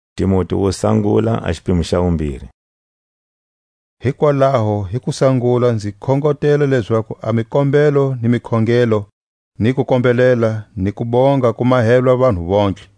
Zileletelo hi tlhelo ga tinhhozo. Hikwalaho hi kusangula nzi khongotela lezaku a mikombelo ni mikhongelo ni kukombelela ni kubonga ku mahelwa vanhu vontlhe;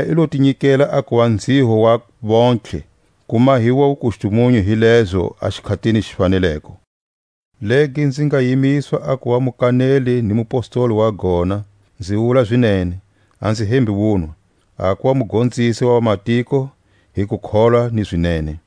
Yena i lo ti nyikela a kuva nzhiho wa vontlhe, ku mahiwa wukustumunyu hi lezo a xikhatini xi faneleko; legi nzi nga yimiswa a kuva mukaneli ni mupostoli wa gona (nzi wula zinene, a nzi hembi wunwa), a kuva mugonzisi wa vamatiko hi kukholwa ni zinene.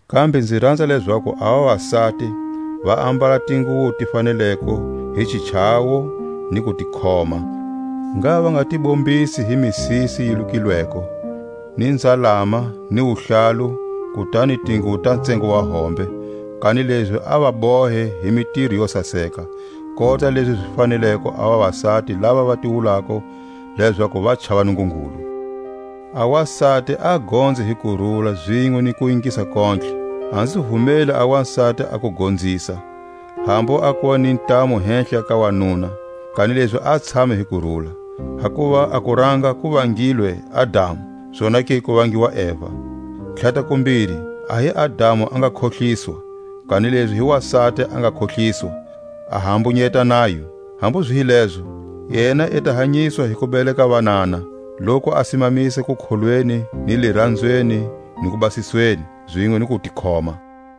Kambe nzi ranza lezaku a vavasati va ambala a tinguwo ti faneleko hi xichawo ni kutikhoma; ngha va nga ti bombisi hi misisi yi lukilweko, ni nzalama ni wuhlalu, kutani tinguwo ta tsengo wa hombe, kanilezi a va hombe hi mitiro yo saseka, kota lezi zi faneleko a vavasati lava va ti wulako lezaku va chava Nungungulu. A wasati a gonze hi kurula zinwe ni kuingisa kontlhe. A nzi vumeli a wasati a ku gonzisa, hambu a kuva ni ntamu hehla ka wanuna, kanilezi a tshame hi kurula. Hakuva a kuranga ku vangilwe Adamu, zonake ku vangiwa Eva. Tlhatakumbiri, a hi Adamu a nga khohliswa, kanilezi hi wasati a nga khohliswa, a hambunyeta nayo. Hambu zi hi lezo, yena i ta hanyiswa hi ku beleka vanana, loku a simamisa kukholweni ni liranzweni ni kubasisweni, zinwe ni kutikhoma.